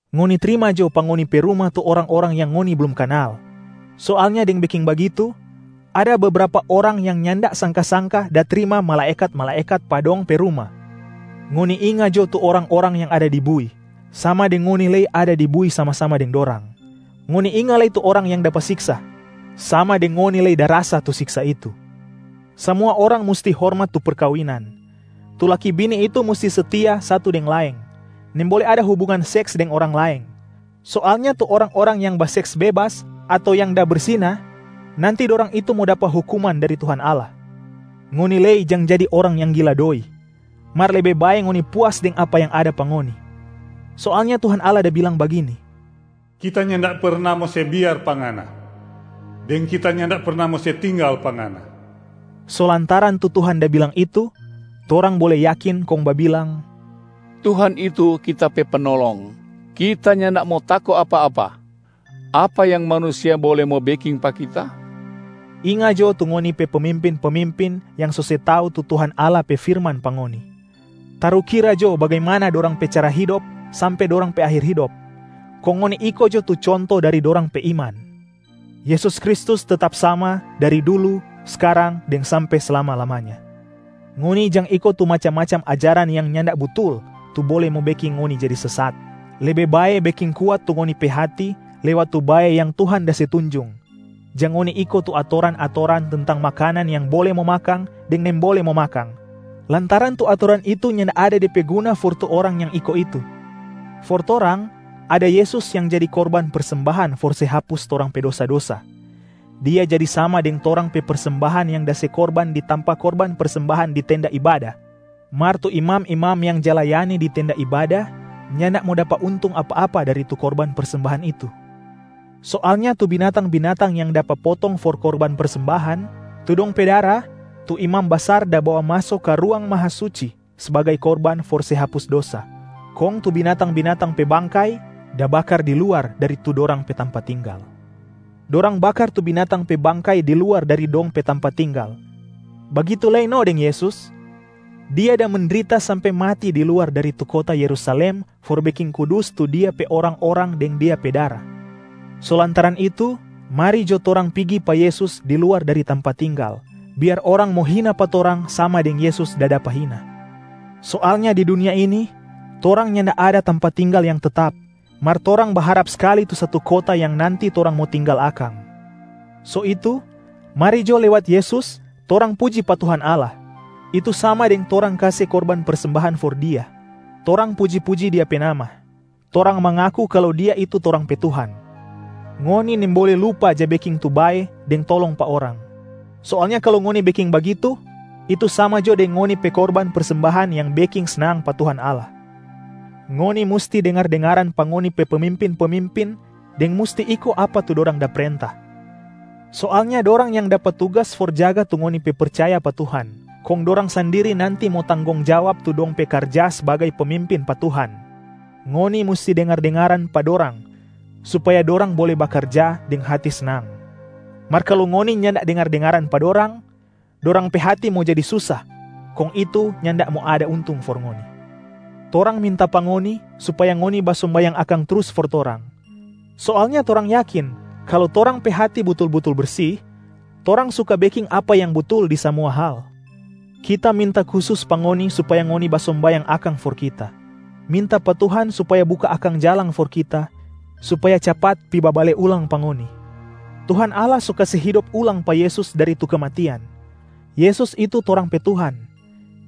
Ngoni trima jo pa ngoni pe ruma tu orang-orang yang ngoni blum kanal. Soalnya deng beking bagitu, ada bebrapa orang yang nyanda sangka-sangka da trima malaekat-malaekat pa dong pe ruma. Ngoni inga jo tu orang-orang yang ada di bui, sama deng ngoni lei ada di bui sama-sama deng dorang. Ngoni inga lei tu orang yang dapa siksa, sama deng ngoni lei da rasa tu siksa itu. Samua orang musti hormat tu perkawinan. Tu laki bini itu musti setia satu deng laeng, nimbole ada hubungan seks deng orang laeng. Soalnya tu orang-orang yang baseks bebas ato yang da bersina, nanti dorang itu mo dapa hukuman dari Tuhan Allah. Ngoni lei jang jadi orang yang gila doi, mar lebe bae ngoni puas deng apa yang ada pa ngoni. Soalnya Tuhan Allah da bilang bagini, “Kita nyanda perna mo se biar pa ngana, deng Kita nyanda perna mo se tinggal pa ngana.” So lantaran tu Tuhan da bilang itu, torang bole yakin kong babilang, “Tuhan itu kita pe Penolong. Kita nyanda mo tako apa-apa, apa yang manusia bole mo beking pa kita?” Inga jo tu ngoni pe pemimpin-pemimpin yang so se tau tu Tuhan Allah pe firman pa ngoni. Tarukira jo bagimana dorang pe cara hidop sampe dorang pe akhir hidop, kong ngoni iko jo tu conto dari dorang pe iman. Yesus Kristus tetap sama, dari dulu, skarang deng sampe slama-lamanya. Ngoni jang iko tu macam-macam ajaran yang nyanda butul tu bole mo beking ngoni jadi sesat. Lebe bae beking kuat tu ngoni pe hati lewat tu bae yang Tuhan da se tunjung, jang ngoni iko tu atoran-atoran tentang makanan yang bole mo makang deng nimbole mo makang, lantaran tu atoran itu nyanda ada de pe guna for tu orang yang iko itu. For torang, ada Yesus yang jadi korban persembahan for se hapus torang pe dosa-dosa, Dia jadi sama deng torang pe persembahan yang da se korban di tampa korban persembahan di tenda ibada, mar tu imam-imam yang ja layani di tenda ibada nyanda mo dapa untung apa-apa dari tu korban persembahan itu. Soalnya tu binatang-binatang yang dapa potong for korban persembahan, tu dong pe dara tu imam basar da bawa maso ka Ruang Mahasuci sbagai korban for se hapus dosa. Kong tu binatang-binatang pe bangkai da bakar di luar dari tu dorang pe tampa tinggal. Dorang bakar tu binatang pe bangkai di luar dari dong pe tampa tinggal, bagitu lei no deng Yesus, Dia da mendrita sampe mati di luar dari tu kota Yerusalem for beking kudus tu Dia pe orang-orang deng Dia pe dara. So lantaran itu, mari jo torang pigi pa Yesus di luar dari tampa tinggal, biar orang mo hina pa torang sama deng Yesus da dapa hina. Soalnya di dunia ini, torang nyanda ada tampa tinggal yang tetap, mar torang baharap skali tu satu kota yang nanti torang mo tinggal akang. So itu, mari jo lewat Yesus torang puji pa Tuhan Allah, itu sama deng torang kase korban persembahan for Dia. Torang puji-puji Dia pe nama, torang mangaku kalu Dia itu torang pe Tuhan. Ngoni nimbole lupa ja beking tu bae deng tolong pa orang. Soalnya kalu ngoni beking bagitu, itu sama jo deng ngoni pe korban persembahan yang beking snang pa Tuhan Allah. Ngoni musti dengar-dengaran pa ngoni pe pemimpin-pemimpin deng musti iko apa tu dorang da prenta. Soalnya dorang yang dapa tugas for jaga tu ngoni pe percaya pa Tuhan, kong dorang sandiri nanti mo tanggong jawab tu dong pe karja sbagai pemimpin pa Tuhan. Ngoni musti dengar-dengaran pa dorang supaya dorang bole bakarja deng hati snang. Mar kalu ngoni nyanda dengar-dengaran pa dorang, dorang pe hati mo jadi susa, kong itu nyanda mo ada untung for ngoni. Torang minta pa ngoni supaya ngoni basombayang akang trus for torang. Soalnya torang yakin kalu torang pe hati butul-butul bersi, torang suka beking apa yang butul di samua hal. Kita minta kusus pa ngoni supaya ngoni basombayang akang for kita, minta pa Tuhan supaya buka akang jalang for kita supaya capat pi babale ulang pa ngoni. Tuhan Allah so kase hidop ulang pa Yesus dari tu kematian. Yesus itu torang pe Tuhan,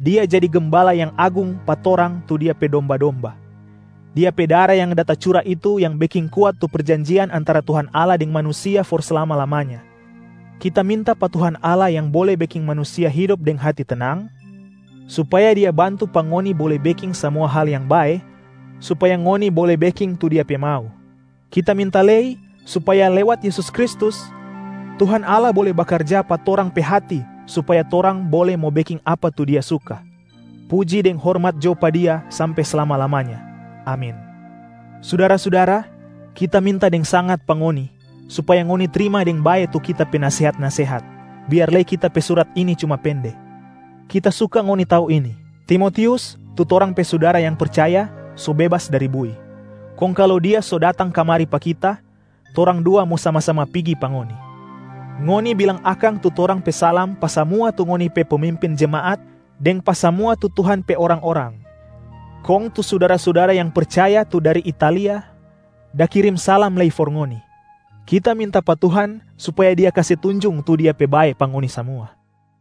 Dia jadi Gembala yang Agung pa torang tu Dia pe domba-domba. Dia pe dara yang da tacura itu yang beking kuat tu perjanjian antara Tuhan Allah deng manusia for slama-lamanya. Kita minta pa Tuhan Allah yang bole beking manusia hidop deng hati tenang, supaya Dia bantu pa ngoni bole beking samua hal yang bae supaya ngoni bole beking tu Dia pe mau. Kita minta lei supaya lewat Yesus Kristus, Tuhan Allah bole bakarja pa torang pe hati supaya torang bole mo beking apa tu Dia suka. Puji deng hormat jo pa Dia sampe slama-lamanya. Amin. Sudara-sudara, kita minta deng sangat pa ngoni supaya ngoni trima deng bae tu kita pe nasehat-nasehat, biar lei kita pe surat ini cuma pende. Kita suka ngoni tau ini: Timotius, tu torang pe sudara yang percaya so bebas dari bui. Kong kalu dia so datang kamari pa kita, torang dua mo sama-sama pigi pa ngoni. Ngoni bilang akang tu torang pe salam pa samua tu ngoni pe pemimpin jemaat deng pa samua tu Tuhan pe orang-orang. Kong tu sudara-sudara yang percaya tu dari Italia da kirim salam lei for ngoni. Kita minta pa Tuhan supaya Dia kase tunjung tu Dia pe bae pa ngoni samua.